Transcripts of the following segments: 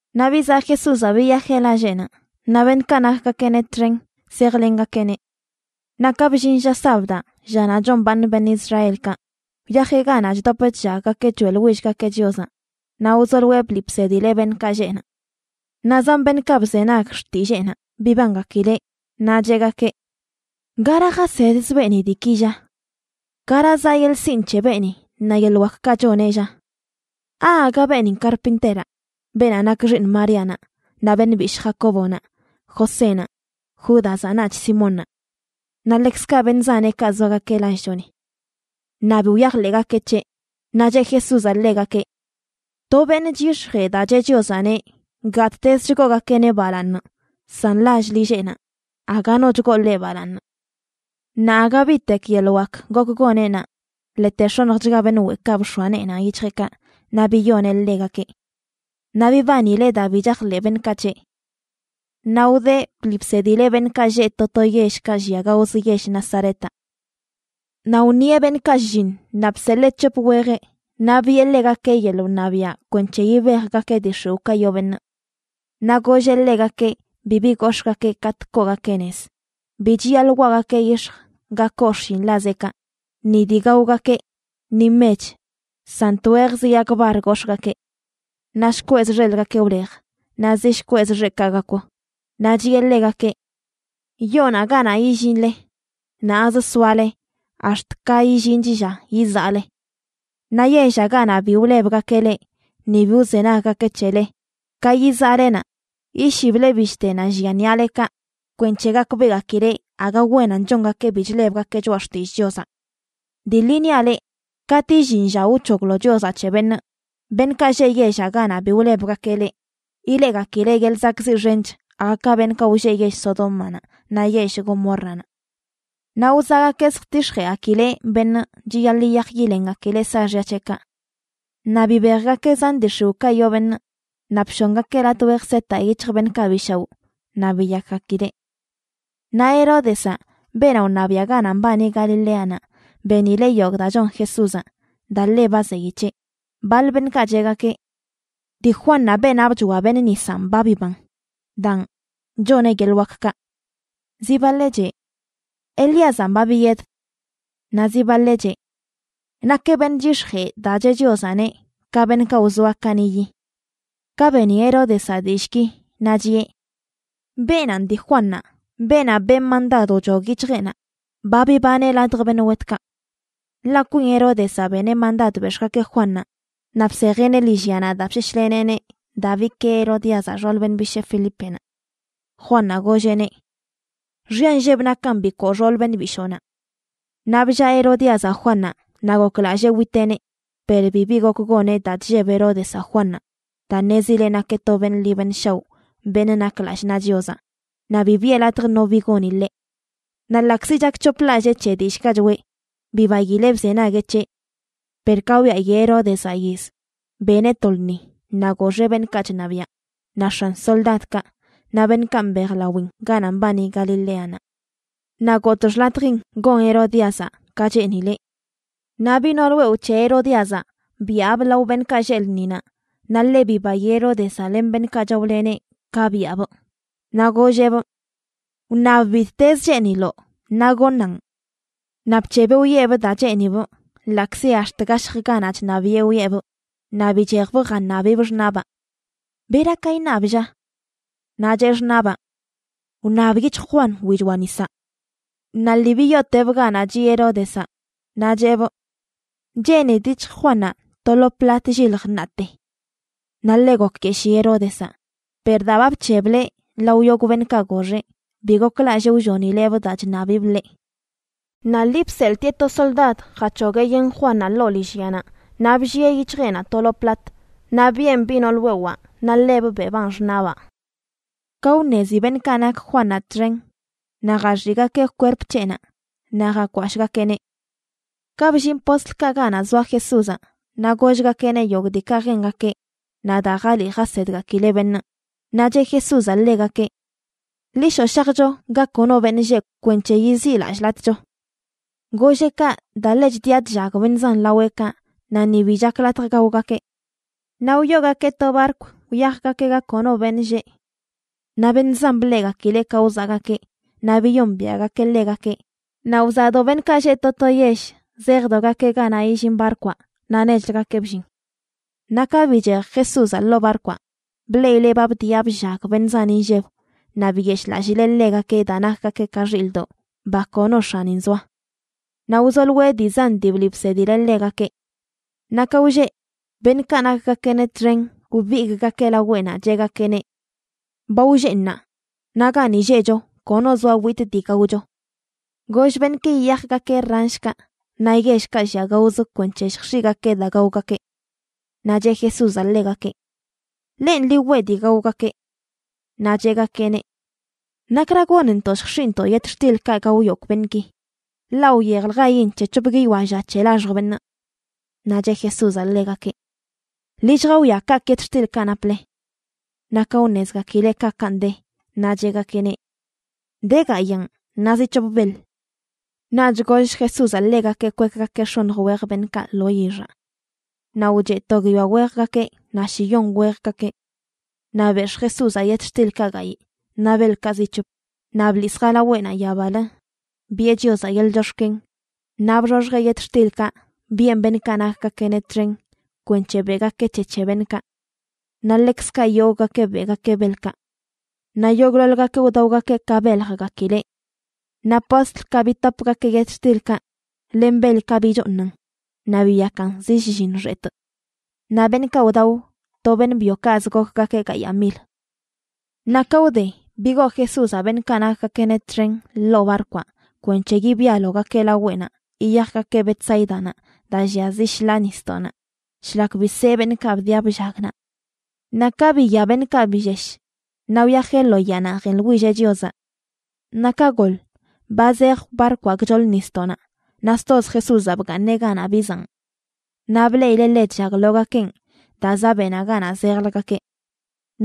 Naꞌ bizaꞌ Jesúzaꞌ biyajeꞌ lalleꞌnaꞌ, naꞌ beṉꞌkaꞌ nakgakeꞌneꞌ txen zejlengakeꞌneꞌ. Naꞌ ka bllin lla sabdaꞌ, llanaꞌ chombaaṉ beṉꞌ Israelkaꞌ, wyajeꞌ ganaꞌ chdop chllaggakeꞌ choeꞌḻwillgakeꞌ Chiozaꞌ naꞌ wzoloeꞌ bliꞌ bsedileꞌ beṉꞌkaꞌ lleꞌ naꞌ. Naꞌ zan beṉꞌkaꞌ bzenag xtilleenaꞌ bibangakileꞌ, naꞌ cheꞌgakeꞌ: ―¿Gara jasedz beeni diiki, lla? ¿Gara zaꞌ yeḻꞌ sinꞌ c̱he beeni, naꞌ yeḻꞌ wakkaꞌ choneꞌ, lla? ¿Aaga beenin karpinteraꞌ, beenaꞌ nak xiiṉ Maríanaꞌ, naꞌ beṉꞌ bishꞌ Jacóbonaꞌ, Josénaꞌ, Júdazaꞌ naꞌch Simónnaꞌ? Naꞌ ḻekzkaꞌ beṉꞌ zaneꞌkaꞌ zoagakeꞌ lallchoni. Naꞌ bi wyajḻeꞌgakeꞌ c̱heꞌ. Naꞌ cheꞌ Jesúzaꞌ ḻegakeꞌ: ―To beṉꞌ chyix̱jee daa cheꞌ Chiozaꞌneꞌ, gattez chgoogakeꞌneꞌ balaaṉ, san lall lilleꞌnaꞌ aga no chgoo ḻeꞌ balaaṉ. Naꞌ aga bitek yeḻꞌ wak gok goneꞌ naꞌ, ḻete x̱onjchga beṉꞌ weꞌkaꞌ bx̱oa neenaꞌ yic̱hjeꞌkaꞌ naꞌ biyoneꞌ ḻegakeꞌ. Naꞌ bibanileꞌ daa bi chajḻeꞌ beṉꞌkaꞌ c̱heꞌ. Naꞌ wdeꞌ bliꞌ bsedileꞌ beṉꞌkaꞌ lleꞌ to to yellkaꞌ llia gaozə yell Nazaretaꞌ. Naꞌ wṉieꞌ beṉꞌkaꞌ shlliṉ, naꞌ bseḻee c̱hop wejeꞌ, naꞌ biꞌe ḻegakeꞌ yeḻꞌ wṉabiaꞌ kwenc̱he yibejgakeꞌ dii x̱iwꞌkaꞌ yoo beṉꞌ. Naꞌ golleꞌ ḻegakeꞌ bibi gox̱ꞌgakeꞌ katꞌ koogakeꞌ nez; bi chiyaḻꞌ waꞌgakeꞌ yix̱j ga koo xshinḻazeꞌkaꞌ, ni dii gaogakeꞌ, ni mech, san twejz yag bar gox̱ꞌgakeꞌ. Naꞌ shkweꞌz xelgakeꞌ wlej, naꞌ zi shkweꞌz xeꞌkaꞌ gakw. Naꞌ chiꞌe ḻegakeꞌ: ―Yoonaꞌ ganaꞌ illinle, naꞌz soale ax̱t ka illinch lla yizaꞌle. Naꞌ yellaꞌ ganaꞌ bi wlebgakeꞌ leꞌ ni bi wzenaggakeꞌ c̱hele, ka yizaꞌle naꞌ, yishible bishtenaꞌ llia ṉiꞌalekaꞌ kwenc̱he gakbeꞌgakileꞌ aga wenan chongakeꞌ bi chlebgakeꞌ choꞌa xtillꞌ Chiozaꞌ. Dii ḻi niaꞌ leꞌ, katꞌ illin lla wc̱hoglo Chiozaꞌ c̱he beṉꞌ, beṉꞌkaꞌ lleꞌ yellaꞌ ganaꞌ bi wlebgakeꞌ leꞌ, ileꞌgakileꞌ yeḻꞌ zakꞌziꞌ xench aga ka beṉꞌkaꞌ wlleꞌ yell Sodómanaꞌ naꞌ yell Gomórranaꞌ. Naꞌ wzaꞌgakeꞌ zjtix̱jeꞌgakileꞌ beṉꞌ chiyaḻꞌ yiyaj yilengakileꞌ saaxya c̱heꞌkaꞌ. Naꞌ bibejgakeꞌ zan dii x̱iwꞌkaꞌ yoo beṉꞌ, naꞌ bshongakeꞌ latꞌ wej setaꞌ yic̱hj beṉꞌkaꞌ bi shaoꞌ naꞌ biyakgakileꞌ. Naꞌ Heródezaꞌ, beenaꞌ wṉabiaꞌ ganaꞌ mbani Galileanaꞌ, benileꞌ yogꞌ daa chon Jesúzaꞌ, daa ḻe ba zeyi c̱heꞌ. Baḻ beṉꞌkaꞌ cheꞌgakeꞌ: ―Dii Juannaꞌ, beenaꞌ bchoa beṉꞌ nisanꞌ ba biban, daan choneꞌ yeḻꞌ wakkaꞌ. Zi baḻeꞌ cheꞌ: ―Elíazanꞌ ba biyed. Naꞌ zi baḻeꞌ cheꞌ: ―Nakeꞌ beṉꞌ chyix̱jee daa cheꞌ Chiozaꞌneꞌ, ka beṉꞌkaꞌ wzoa kaniꞌyi. Ka beni Heródezaꞌ dillꞌki, naꞌ chiꞌe: ―¡Beenanꞌ dii Juannaꞌ, beenaꞌ benꞌ mandad wchog yic̱hjeꞌnaꞌ! ¡Ba bibaneꞌ ladj beṉꞌ wetkaꞌ! Ḻaꞌ kwin Heródezaꞌ beneꞌ mandad bex̱ꞌgakeꞌ Juannaꞌ naꞌ bsejeꞌneꞌ lillyanaꞌ daa bseshleneꞌneꞌ daa bikee Herodíazaꞌ, xool beṉꞌ bishee, Felípenaꞌ. Juannaꞌ golleꞌneꞌ: ―Xya nlleb nakan bikoo xool beṉꞌ bishoonaꞌ. Naꞌ bllaa Herodíazaꞌ Juannaꞌ naꞌ goklallee witeꞌneꞌ, per bibi gok goneꞌ daa chlleb Heródezaꞌ Juannaꞌ, daa ṉezileꞌ nakeꞌ to beṉꞌ ḻi beṉꞌ shaoꞌ beṉꞌ nak lallꞌ naꞌ Chiozaꞌ, naꞌ bi biꞌe latj no bi goni ḻeꞌ. Naꞌ ḻaꞌkzi chakc̱hoplallee c̱he dillꞌkaꞌ choꞌe, bibaileꞌ bzenagueꞌ c̱heꞌ. Per ka wyayi Heródezaꞌ yiz, beneꞌ to lṉi naꞌ goxeꞌ beṉꞌkaꞌ chṉabiaꞌ, naꞌ x̱an soldadkaꞌ, naꞌ beṉꞌkaꞌ mbejlawin ganaꞌ mbani Galileanaꞌ. Naꞌ gotꞌ xḻatjin gon Herodíazaꞌ ka cheenileꞌ. Naꞌ biꞌ nool wewꞌ c̱he Herodíazaꞌ byaabꞌ lao beṉꞌkaꞌ lleꞌ lṉinaꞌ, naꞌ ḻe bibayi Heródezaꞌ len beṉꞌkaꞌ chaoleneꞌ ka byaabꞌ. Naꞌ golleꞌbꞌ: ―Wṉab bittezə cheeniloꞌ naꞌ goṉaꞌn. Naꞌ bc̱hebeꞌ wiꞌebꞌ daa cheenibꞌ, ḻaꞌkzi ax̱t gashj ganaꞌ chṉabiꞌe wiꞌebꞌ. Naꞌ bichejbꞌ jaṉabibꞌ xṉaꞌbaa: ―¿Bera ka iṉabꞌ, lla? Naꞌ cheꞌ xṉaꞌbaa: ―Wṉab yic̱hj Juan wichoa nisaꞌ. Naꞌ lii biyootebꞌ ganaꞌ chiꞌ Heródezaꞌ, naꞌ cheꞌbꞌ: ―Cheenidꞌ yic̱hj Juannaꞌ to lo plat llilj ṉaate. Naꞌ ḻe gokyeshii Heródezaꞌ, per daa ba bc̱hebleꞌ lao yogꞌ beṉꞌkaꞌ goxeꞌ, bi goklallee wllonileꞌbꞌ daa chṉabibꞌ ḻeꞌ. Naꞌ lii bseḻꞌtieꞌ to soldad jac̱hogueꞌ yen Juannaꞌ ḻoo lillyanaꞌ naꞌ bllieꞌ yic̱hjeꞌnaꞌ to lo plat. Naꞌ biꞌen biꞌ nool wewaa naꞌ ḻebꞌ beꞌbaan xṉaꞌbaa. Ka wṉezi beṉꞌkaꞌ nak Juannaꞌ txen, naꞌ jaxiꞌgakeꞌ kwerp c̱heꞌnaꞌ naꞌ jakwashꞌgakeꞌneꞌ. Ka billin postlkaꞌ ganaꞌ zoa Jesúzaꞌ, naꞌ gollgakeꞌneꞌ yogꞌ diikaꞌ jengakeꞌ naꞌ daa jaliꞌ jasedgakileꞌ beṉꞌ. Naꞌ cheꞌ Jesúzaꞌ ḻegakeꞌ: ―Ḻi shoꞌ shajcho ga kono beṉꞌ lleꞌ kwenc̱he yiziꞌlallꞌlatꞌcho. Golleꞌ kaꞌ daa ḻe chdia chllag beṉꞌ zan laweꞌkaꞌ, naꞌ ni bi chak latj gaogakeꞌ. Naꞌ wyoogakeꞌ to barkw wyajgakeꞌ ga kono beṉꞌ lleꞌ. Naꞌ beṉꞌ zan bleꞌgakileꞌ ka wzaꞌgakeꞌ naꞌ biyombiaꞌgakeꞌ ḻegakeꞌ, naꞌ wzaꞌdo beṉꞌkaꞌ lleꞌ to to yell zejdogakeꞌ ganaꞌ illin barkwaꞌ naꞌ nechləgakeꞌ bllin. Naꞌ ka bichej Jesúzaꞌ ḻoo barkwaꞌ bleꞌileꞌ ba bdiꞌa bllag beṉꞌ zan inlleb naꞌ biyeshꞌlallileꞌ ḻegakeꞌ daa nakgakeꞌ ka xilꞌdoꞌ, ba kono x̱anin zoa. Naꞌ wzoloeꞌ dii zan dii bliꞌ bsedileꞌ ḻegakeꞌ. Naꞌ ka wlleꞌ, beṉꞌkaꞌ nakgakeꞌneꞌ txen wbigꞌgakeꞌ laweꞌnaꞌ cheꞌgakeꞌneꞌ: ―Ba wlleꞌ ṉaa, naꞌ gani lleꞌcho kono zoa witꞌ dii gaocho. Goll beṉꞌki yiyajgakeꞌ ranshkaꞌ, naꞌ yellkaꞌ llia gaozə kwenc̱he lljx̱iꞌgakeꞌ daa gaogakeꞌ. Naꞌ cheꞌ Jesúzaꞌ ḻegakeꞌ: ―Lenꞌ, ḻi weꞌ dii gaogakeꞌ. Naꞌ cheꞌgakeꞌneꞌ: ―¿Nakra gonntoꞌ lljx̱iꞌntoꞌ yetxtilkaꞌ gao yogꞌ beṉꞌki? ḻaꞌ wyejljain c̱he c̱hop guiyoa lla c̱he laxj beṉꞌ. Naꞌ cheꞌ Jesúzaꞌ ḻegakeꞌ: ―Ḻi lljawia kaꞌkꞌ yetxtilkaꞌ naple. Naꞌ ka wṉezgakileꞌ kaꞌkaꞌn de, naꞌ cheꞌgakeꞌneꞌ: ―De gayaan, naꞌ zi c̱hop beḻ. Naꞌch goll Jesúzaꞌ ḻegakeꞌ kwekgakeꞌ x̱oṉj wej beṉꞌkaꞌ lo yixaꞌ. Naꞌ wcheꞌ to guiyoa wejgakeꞌ naꞌ shiyon wejgakeꞌ. Naꞌ bex̱ꞌ Jesúzaꞌ yetxtilkaꞌ gayꞌ naꞌ beḻkaꞌ zi c̱hop naꞌ bḻis jalaweꞌnaꞌ yabalə biꞌe Chiozaꞌ yeḻꞌ chox̱ken, naꞌ bxoxjeꞌ yetxtilkaꞌ biꞌen beṉꞌkaꞌ nakgakeꞌneꞌ txen kwenc̱he beꞌgakeꞌ c̱he c̱he beṉꞌkaꞌ. Naꞌ ḻekzkaꞌ yogꞌgakeꞌ beꞌgakeꞌ beḻkaꞌ. Naꞌ yogꞌḻoḻgakeꞌ wdaogakeꞌ ka beljgakileꞌ. Naꞌ postlkaꞌ bitopgakeꞌ yetxtilkaꞌ len beḻkaꞌ bichooṉan, naꞌ biyakan zi shlliṉ xetꞌ. Naꞌ beṉꞌkaꞌ wdao, to beṉꞌ byokaꞌzə gokgakeꞌ gayaa mil. Naꞌ ka wde, bigoo Jesúzaꞌ beṉꞌkaꞌ nakgakeꞌneꞌ txen ḻoo barkwaꞌ kwenc̱he yibialogakeꞌ laweꞌnaꞌ yiyajgakeꞌ Betsáidanaꞌ daa llia zi shḻaa nisdoꞌnaꞌ, shlak bisee beṉꞌkaꞌ bdiꞌa bllag naꞌ. Naꞌ ka biya beṉꞌkaꞌ billesh, naꞌ wyajeꞌ lo yaanaꞌ jeḻwilleꞌ Chiozaꞌ. Naꞌ ka goḻ, ba zej barkwaꞌ gchoḻ nisdoꞌnaꞌ naꞌ stoz Jesúzaꞌ bgaaṉeꞌ ganaꞌ bizaꞌn. Naꞌ bleꞌileꞌ ḻe chllaglogakenꞌ daa zaꞌ beꞌnaꞌ ganaꞌ zejləgakeꞌ.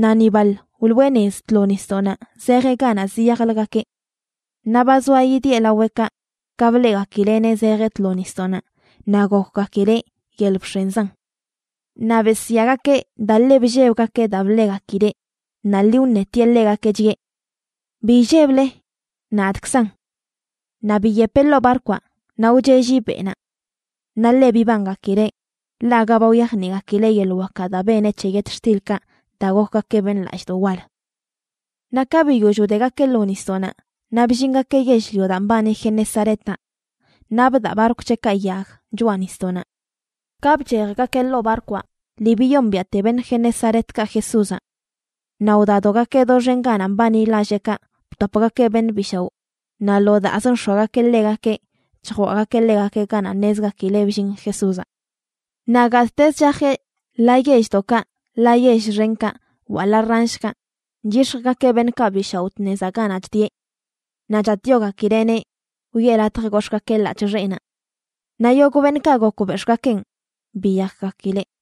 Naꞌ ni baḻ wloꞌe nez tlo nisdoꞌnaꞌ zejeꞌ ganaꞌ ziyajlgakeꞌ. Naꞌ ba zoa yidieꞌ laweꞌkaꞌ ka bleꞌgakileꞌneꞌ zejeꞌ tlo nisdoꞌnaꞌ naꞌ gokgakileꞌ yel bx̱enzan. Naꞌ besyaagakeꞌ daa ḻe bllebgakeꞌ daa bleꞌgakileꞌ. Naꞌ lii wṉetieꞌ ḻegakeꞌ, chiꞌe: ―Bi illeble, nadꞌkzan. Naꞌ biyepeꞌ ḻoo barkwaꞌ naꞌ wcheꞌlli beꞌnaꞌ. Naꞌ ḻe bibangakileꞌ, ḻaꞌ aga ba wyajniꞌgakileꞌ yeḻꞌ wakaꞌ daa beneꞌ c̱he yetxtilkaꞌ daa gokgakeꞌ beṉꞌ lallꞌdoꞌ wal. Naꞌ ka biyoll wdegakeꞌ lo nisdoꞌnaꞌ naꞌ bllingakeꞌ yell-lio daa mbani Genesaretaꞌ, naꞌ bdaꞌ barkw c̱heꞌkaꞌ yag choꞌa nisdoꞌnaꞌ. Ka bchejgakeꞌ ḻoo barkwaꞌ, lii biyombiaꞌte beṉꞌ Genesaretkaꞌ Jesúzaꞌ. Naꞌ wdadogakeꞌ doxen ganaꞌ mbani lalleꞌkaꞌ btopgakeꞌ beṉꞌ bi shaoꞌ, naꞌ lo daazə nx̱oagakeꞌ ḻegakeꞌ chjwaꞌgakeꞌ ḻegakeꞌ ganaꞌ ṉezgakileꞌ bllin Jesúzaꞌ. Naꞌ gattezə chajeꞌ ḻaa yelldoꞌkaꞌ ḻaa yell xenkaꞌ, wa ḻaa ranshkaꞌ, chyix̱jgakeꞌ beṉꞌkaꞌ bi shaoꞌ tnezaꞌ ganaꞌ chdieꞌ. Naꞌ chatꞌyogakileꞌneꞌ wiꞌe latj gox̱ꞌgakeꞌ ḻaꞌc̱hꞌ xeꞌnaꞌ. Naꞌ yogꞌ beṉꞌkaꞌ gok bex̱ꞌgakeꞌn biyakgakileꞌ.